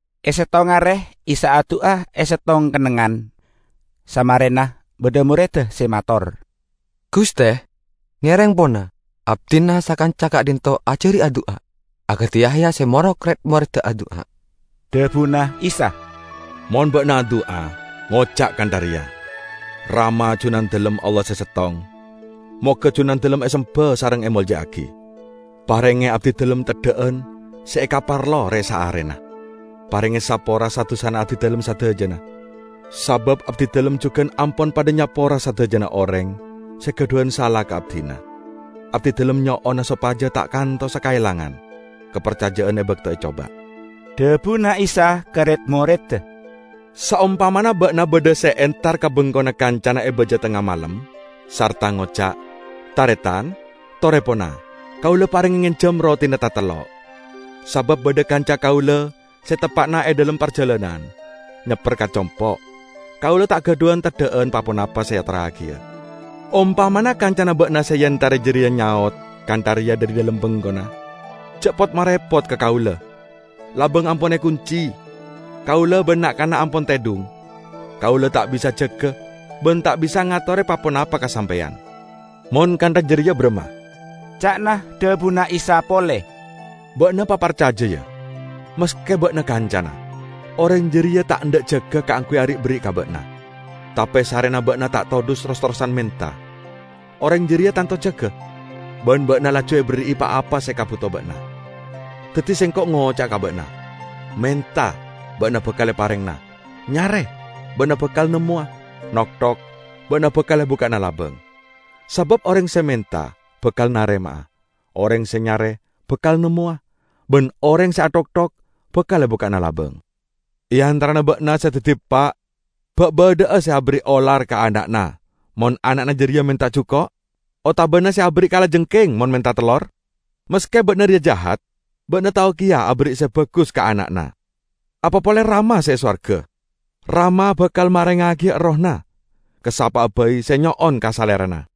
E settong are Isa adu'a e settong kennengngan. Samarena, badha moredda se mator, "Guste, ngereng pona, abdina sakanca ka'dhinto' ajari adu'a akadi Yahya se morok red-moredda adu'a." Dhabuna Isa, "Mon ba'na adu'a, ngoca' kantha reya, 'Rama, Junandalem Allah se Settong. Moga Junandalem esemba sareng emolja'agi. Parenge abdidalem teddha'an se ekaparlo re-saarena. Parenge sapora sa-dusa abdidalem sadajana sabab abdidalem jugan ampon padha nyapora sadajana oreng se gadhuwan sala ka abdina. Abdidalem nyo'ona sopaja ta' kantosa kaelangan kaparcaja'an e bakto ecoba.' " Dhabuna Isa ka red-moredda, "Saompamana ba'na badha se entar ka bengkona kancana e baja tengnga malem, sarta ngoca', 'Taretan, tore pona, kaula parenge ngenjam rotina tatello'. Sabab badha kanca kaula se teppa'na e dhalem parjalanan, nyepper ka compo', kaula ta' gadhuwan teddha'an pa-ponapa se eatorragiya!' Ompamana kancana ba'na se eentare jareya nyaot kantha reya dhari dhalem bengkona, 'Ja' pot-marepot ka kaula! Labang ampon ekunci, kaula ban na'-kana' ampon tedhung. Kaula ta' bisa jaga ban ta' bisa ngatore pa-ponapa ka sampeyan.' " "Mon kantha jareya baramma?" ca'na dhabuna Isa pole. "Ba'na paparcaja, ya. Maske ba'na kancana, oreng jareya ta' endha' jaga kaangguy ari'-berri' ka ba'na. Tape sarrena ba'na ta' todhus ros-terrosan menta, oreng jareya tanto jaga, ban ba'na laju eberri'i pa-apa se ekabuto ba'na. Daddi, Sengko' ngoca'a ka ba'na: Menta, ba'na bakal eparengngana; nyare, ba'na bakal nemmowa; nokthok, ba'na bakal ebukka'ana labang. Sabab oreng se menta bakal narema'a; oreng se nyare bakal nemmowa, ban oreng se athokthok bakal ebukka'ana labang. E antarana ba'na se daddi eppa' ba' badha'a se aberri' olar ka ana'na mon ana'na jareya menta juko'? Otabana se aberri' kalajengking mon menta tellor? Maske ba'na reya jahat, ba'na tao keya aberri' se bagus ka ana'na. Apa pole Rama se e sowarga! Rama bakal marengngagiya Errohna ka sapa'a bai se nyo'on ka Salerana!"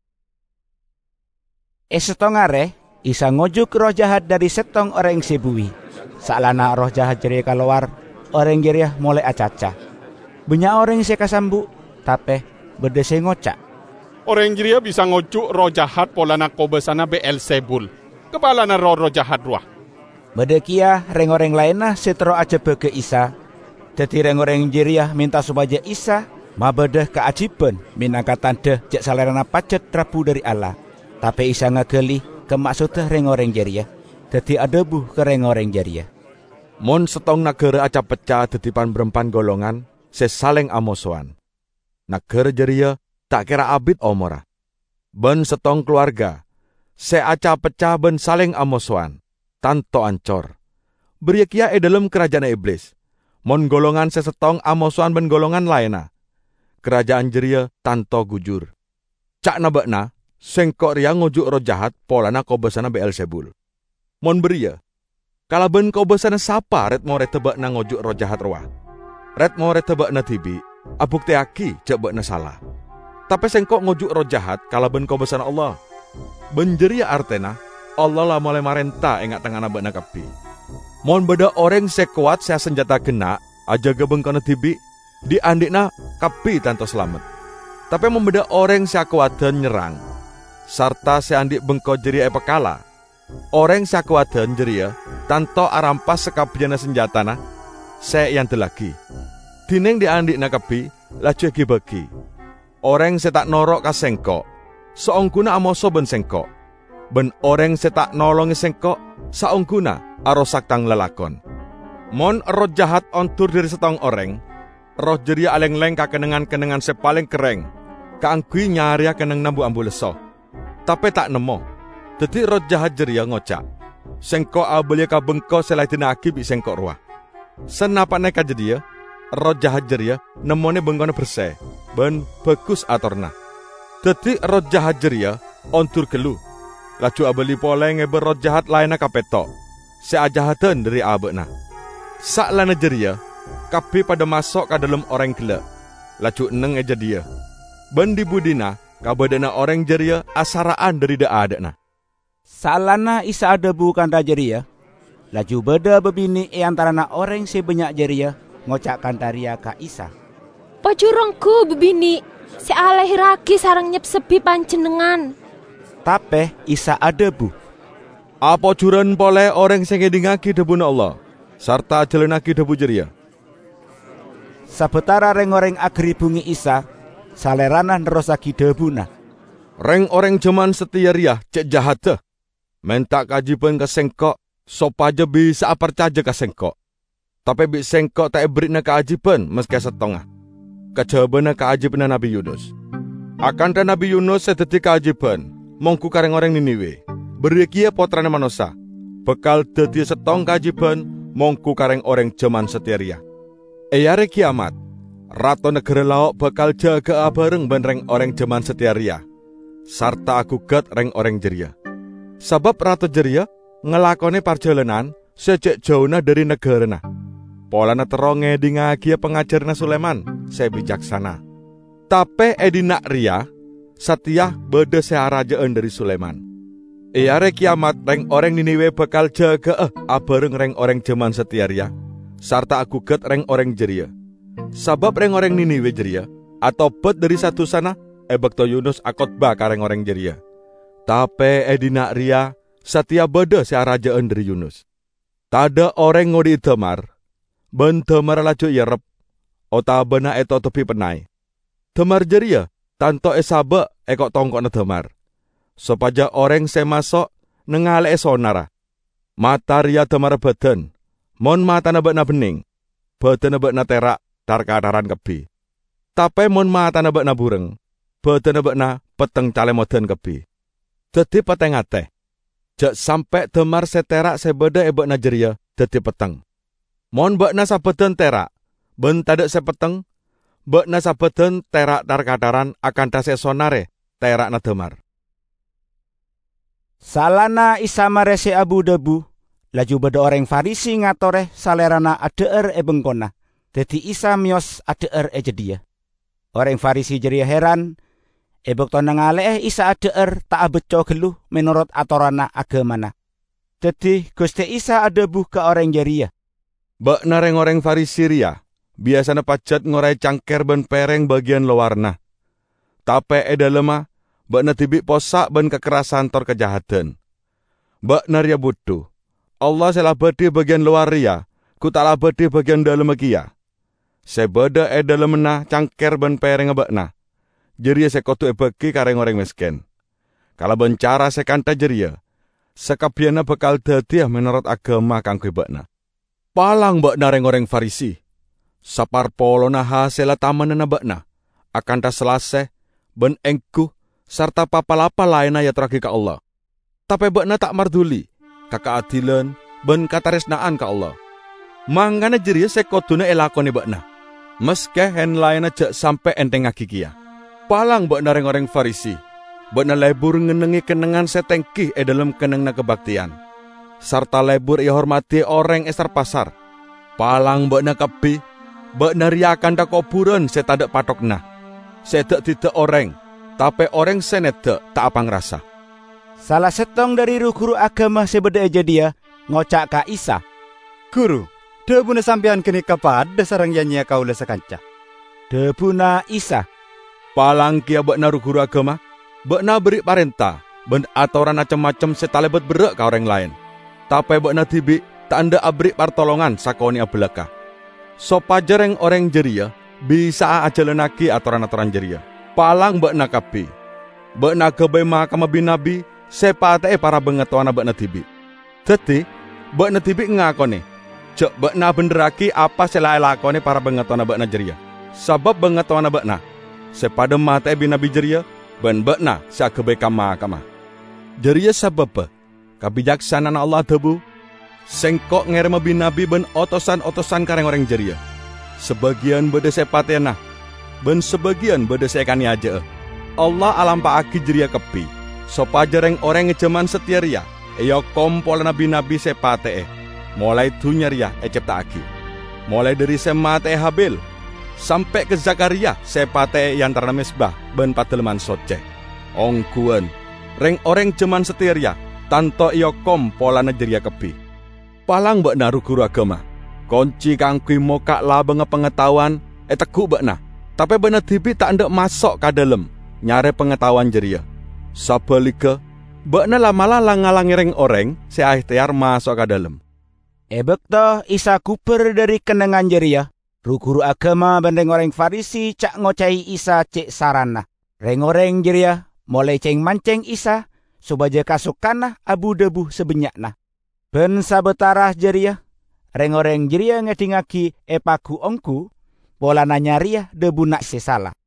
E settong are Isa ngojuk erroh jahat dhari settong oreng se buwi. Saellana erroh jahat jareya kalowar, oreng jareya molae acaca. Bannya' oreng se kasambu', tape badha se ngoca', "Oreng jareya bisa ngojuk erroh jahat polana kobasana Be'elzebul, kapalana roh-erroh jahat rowa." Badha keya reng-oreng laenna se terro ajebbaga Isa, daddi reng-oreng jareya menta sopaja Isa mabadha kaajiban menangka tandha ja' Salerana pajat rabu dhari Allah. Tape Isa ngagali ka maksodda reng-oreng jareya, daddi adhabu ka reng-oreng jareya, "Mon settong nagara aca-pecca daddi pan-barampan golongan se saleng amosowan, nagara jareya ta' kera abit omorra. Ban settong kalowarga se aca-pecca ban saleng amosowan, tanto ancor. Bariya keya e dhalem karaja'anna Iblis; mon golongan se settong amosowan ban golongan laenna, karaja'an jareya tanto gujur. Ca'na ba'na Sengko' reya ngojuk erroh jahat polana kobasana Be'elzebul. Mon bariya, kalaban kobasana sapa red-moredda ba'na ngojuk erroh jahat rowa? Red-moredda ba'na dibi' abukteyagi ja' ba'na sala! Tape Sengko' ngojuk erroh jahat kalaban kobasana Allah, ban jareya artena Allah la molae marenta e nga'-tengnga'anna ba'na kabbi. Mon badha oreng se kowat, se asanjata genna', ajaga bengkona dibi', dhi'-andhi'na kabbi tanto salamet. Tape mon badha oreng se akowadan nyerrang, sarta se andhi' bengko jareya epakala, oreng se akowadan jareya tanto arampas sakabbiyanna sanjatana se eandellagi, dineng dhi'-andhi'na kabbi laju egi-bagi. Oreng se ta' noro' ka Sengko', saongguna amoso ban Sengko', ban oreng se ta' nolonge Sengko', saongguna arosak Tang lalakon!" "Mon erroh jahat ondur dhari settong oreng, erroh jareya alengleng ka kennengngan-kennengngan se paleng kerreng kaangguy nyareya kennengnganna bu-ambu lesso, tape ta' nemmo. Daddi, erroh jahat jareya ngoca', 'Sengko' abaliya ka bengko se la edina'agi bi' sengko' rowa!' Sanapa'na ka jadhiya, erroh jahat jareya nemmone bengkona berse ban bagus atoranna. Daddi erroh jahat jareya ondur gallu, laju abali pole ngeba erroh jahat laenna kapetto se ajahadan dhari aba'na. Saellana jareya kabbi padha maso' ka dhalem oreng gella', laju enneng e jadhiya. Ban dhi-budhina kabadha'anna oreng jareya asara'an dhari dha'-adha'na." Saellana Isa adhabu kantha jareya, laju badha babine' e antarana oreng se bannya' jareya, ngoca' kantha reya ka Isa, "Pojur onggu babine' se alahirragi sareng nyepsebbi Panjennengngan!" Tape Isa adhabu, "Apojuran pole oreng se ngedhingngagi dhabuna Allah sarta ajalannagi dhabu jareya!" Sabatara reng-oreng agaribbunge Isa, Salerana nerrossagi dhabuna, "Reng-oreng jaman sateya reya ce' jahadda. Menta kaajiban ka Sengko' sopaja bisa'a parcaja ka Sengko', tape bi' Sengko' ta' eberri'ana kaajiban maske settonga, kajabana kaajibanna Nabbi Yunus. Akantha Nabbi Yunus se daddi kaajiban monggu ka reng-oreng Niniwe, bariya keya Pottrana Manossa bakal daddiya settong kaajiban monggu ka reng-oreng jaman sateya reya. E Are Keyamat, Rato nagara Lao' bakal jaga'a abareng ban reng-oreng jaman sateya reya sarta agugat reng-oreng jareya. Sabab, Rato jareya ngalakone parjalanan se ce' jauna dhari nagarana polana terro ngedhingngagiya pangajaranna Sulaiman se bicaksana. Tape e dhinna' reya sateya badha se araja'an dhari Sulaiman. E Are Keyamat reng-oreng Niniwe bakal jaga'a abareng reng-oreng jaman sateya reya, sarta agugat reng-oreng jareya, sabab reng-oreng Niniwe jareya atobat dhari sa-dusana e bakto Yunus akotbah ka reng-oreng jareya. Tape e dhinna' reya sateya badha se araja'an dhari Yunus!" "Tadha' oreng ngodhi'i damar, ban damarra laju eerrep otabana etotobi pennay. Damar jareya tanto esaba' e ko'-tongko'na damar, sopaja oreng se maso' nangale'e sonarra. Mata reya damarra badan. Mon matana ba'na benneng, badanna ba'na tera' tar-kataran kabbi. Tape mon matana ba'na bureng, badanna ba'na petteng calemodan kabbi. Daddi pate-ngate, ja' sampe' damar se tera' se badha e ba'na jareya daddi petteng. Mon ba'na sabadan tera', ban tadha' se petteng, ba'na sabadan tera' tar-kataran akantha se esonare tera'na damar." Saellana Isa mare se abu-dhabu, laju badha oreng Farisi ngatore Salerana adha'ar e bengkona. Daddi Isa meyos adha'ar e jadhiya. Oreng Farisi jareya heran e bakto nangale'e Isa adha'ar ta' abacco gallu menorot atoranna agamana. Daddi Guste Isa adhabu ka oreng jareya, "Ba'na reng-oreng Farisi reya biyasana pajat ngorae cangker ban pereng bagiyan lowaranna, tape e dhalemma ba'na dibi' possa' ban kakerrasan tor kajahadan. Ba'na reya budhu! Allah se la abadhi bagiyan lowar reya gu ta' la abadhi bagiyan dhalemma keya? Se badha e dhalemmanna cangker ban perengnga ba'na, jareya se kodu ebagi ka reng-oreng mesken. Kalaban cara se kantha jareya, sakabbiyanna bakal daddiya menorot agama kaangguy ba'na. Palang ba'na, reng-oreng Farisi! Saparpolonna hasella tamennanna ba'na, akantha salase ban enggu sarta pa-palappa laenna eatorragi ka Allah, tape ba'na ta' marduli ka kaadilan ban kataresna'an ka Allah. Mangkana jareya se koduna elakone ba'na, maske en-laenna ja' sampe' enthengngagi keya. Palang ba'na, reng-oreng Farisi! Ba'na lebur ngennengnge kennengngan se tenggi e dhalem kennengnganna kabakteyan, sarta lebur ehormadi oreng e sar-pasar. Palang ba'na kabbi! Ba'na reya akantha koburan se tadha' patthoganna, se eda'-didda' oreng, tape oreng se nedda' ta' apangrasa." Sala settong dhari ru-guru agama se badha e jadhiya ngoca' ka Isa, "Guru, dhabuna Sampeyan ganeka padha sareng ya-nyeya kaula sakanca!" Dhabuna Isa, "Palang keya ba'na, ru-guru agama! Ba'na aberri' parenta ban atoran acem-macem se talebat berra' ka oreng laen, tape ba'na dibi' ta' endha' aberri' partolongan sakone'a balakka' sopaja reng-oreng jareya bisa'a ajalannagi atoran-atoran jareya. Palang ba'na kabbi! Ba'na agabay makamma bi-nabbi, se epate'e para bangatowana ba'na dibi'. Daddi ba'na dibi' ngakone ja' ba'na abendherragi apa se la elakone para bangatowana ba'na jareya; sabab bangatowana ba'na se padha mate'e bi-nabbi jareya ban ba'na se agabay kam-makamma. Jareya sababba Kabicaksana'anna Allah adhabu, 'Sengko' ngerema bi-nabbi ban otosan-otosan ka reng-oreng jareya; sabagiyan badha se epateyana ban sabagiyan badha se ekaneyaja'a.' Allah alampa'agi jareya kabbi sopaja reng-oreng e jaman sateya reya eokom polana bi-nabbi se epate'e molae dunnya reya ecepta'agi, molae dhari se mate'e Habil sampe' ka Zakhariya, se epate'e e antarana mezba ban Padalemman Socce. Ongguwan: Reng-oreng jaman sateya reya tanto eokom polana jareya kabbi. Palang ba'na, ru-guru agama! Konci kaangguy mokka' labangnga pangataowan eteggu' ba'na, tape ba'na dibi' ta' endha' maso' ka dhalem nyare pangataowan jareya. Sabaligga ba'na la'-mala' lang-ngalange reng-oreng se aehteyar maso'a ka dhalem!" E bakto Isa gubar dhari kennengngan jareya, ru-guru agama ban reng-oreng Farisi ca'-ngoca'e Isa ce' sarana. Reng-oreng jareya molae ceng-manceng Isa sopaja kasokana abu-dhabu sabannya'na. Ban sabatara jareya reng-oreng jareya ngedhingngagi epagu-onggu polana nyareya dhabuna se sala.